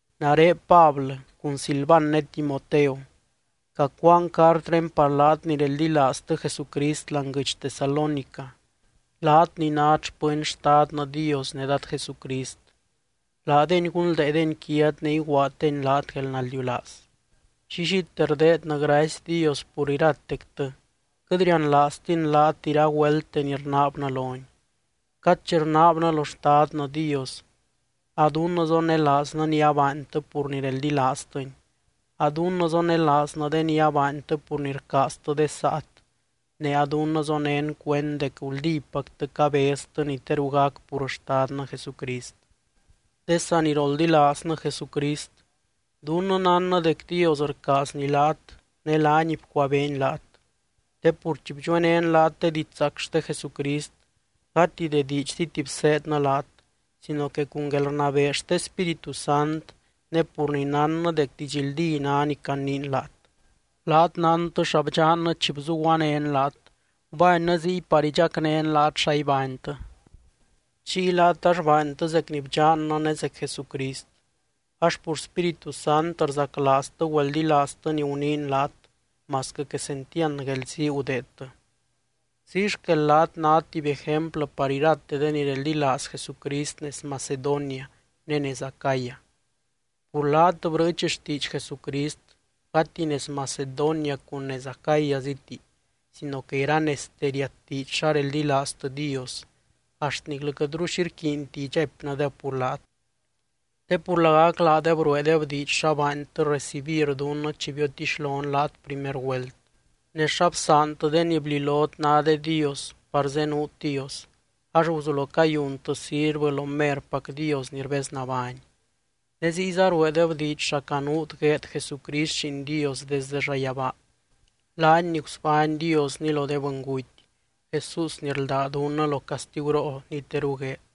Nare Pablɨ, cun Silvan ne Timoteo, cacuaan cartré par laat ni reldilaaztɨ Jesucrist láani guɨdx Tesalónica, laat ni nát xpɨny Xtadnɨ Dios ne Dad Jesucrist. Laadeny gunldeedeny quiat ne iguaaddeny laat guelnaldiulaaz. Llillite rdeednɨ gracy Dios pur iratectɨ, quɨt rianlaaztin laat iragüelte ni rnaabnɨ lony. Cad chi rnaabnɨ lo Xtadnɨ Dios, a dunnɨ zonelaaznɨ ni abaantɨ pur ni reldilaaztɨny, a dunnɨ zonelaaznɨ de ni abaantɨ pur ni rcaaztɨ de saat, ne a dunnɨ zonén cuend dec guldípactɨ cabeztɨ ni teru gac pur Xtadnɨ Jesucrist. De saniroldilaaznɨ Jesucrist, dunnɨ nánnɨ dec Dios rcaazny laat ne laany bcuabeeny laat. Te pur chi bdxuenén laat de didxzaac xte Jesucrist, gati de diidxziti bseednɨ laat sino que cun guelrnabee xte Spíritu Sant ne pur ni nánnɨ dec didxldí ná ni caniin laat. Laat nántɨ xa bdxannɨ chi bzuguanén laat, gubánnɨ ziy par idxacnén laat xa ibánytɨ. Chiy laat ax baantɨ zec ni bdxannɨ ne zec Jesucrist, ax pur Spíritu Sant rzaclaaztɨ güeldilaaztɨ ni guniin laat masquɨ quesentiand guelzii gudeedtɨ. Ziy xquel laat nát tuby ejemplɨ par irate de ni reldilaaz Jesucrist nez Macedonia ne nez Acaya. Pur laat brɨɨch xtiidx Jesucrist gati nez Macedonia cun nez Acayaziti sino que iranezte riatdiidx xa reldilaaztɨ Dios, axt niclɨ quɨtru xi rquiinti idxaipnɨdeb pur laat. Te pur lagac laadeb rueedeb diidx xa baantɨ recibir dunnɨ chi biotixlon laat primer güelt, ne xa bsaantɨ de ni blilot ná de dios par zenuut Dios, ax guzulo cayuntɨ sirvɨ lo merpac Dios ni rbeznabány. Ne ziyza rueedeb diidx xa canuut gueed Jesucrist Lliin Dios desde llayabaa, laany ni gusbány Diosny lo de bɨnguty, Jesús ni rldá dunnɨ lo castiguroo ni teru gueed.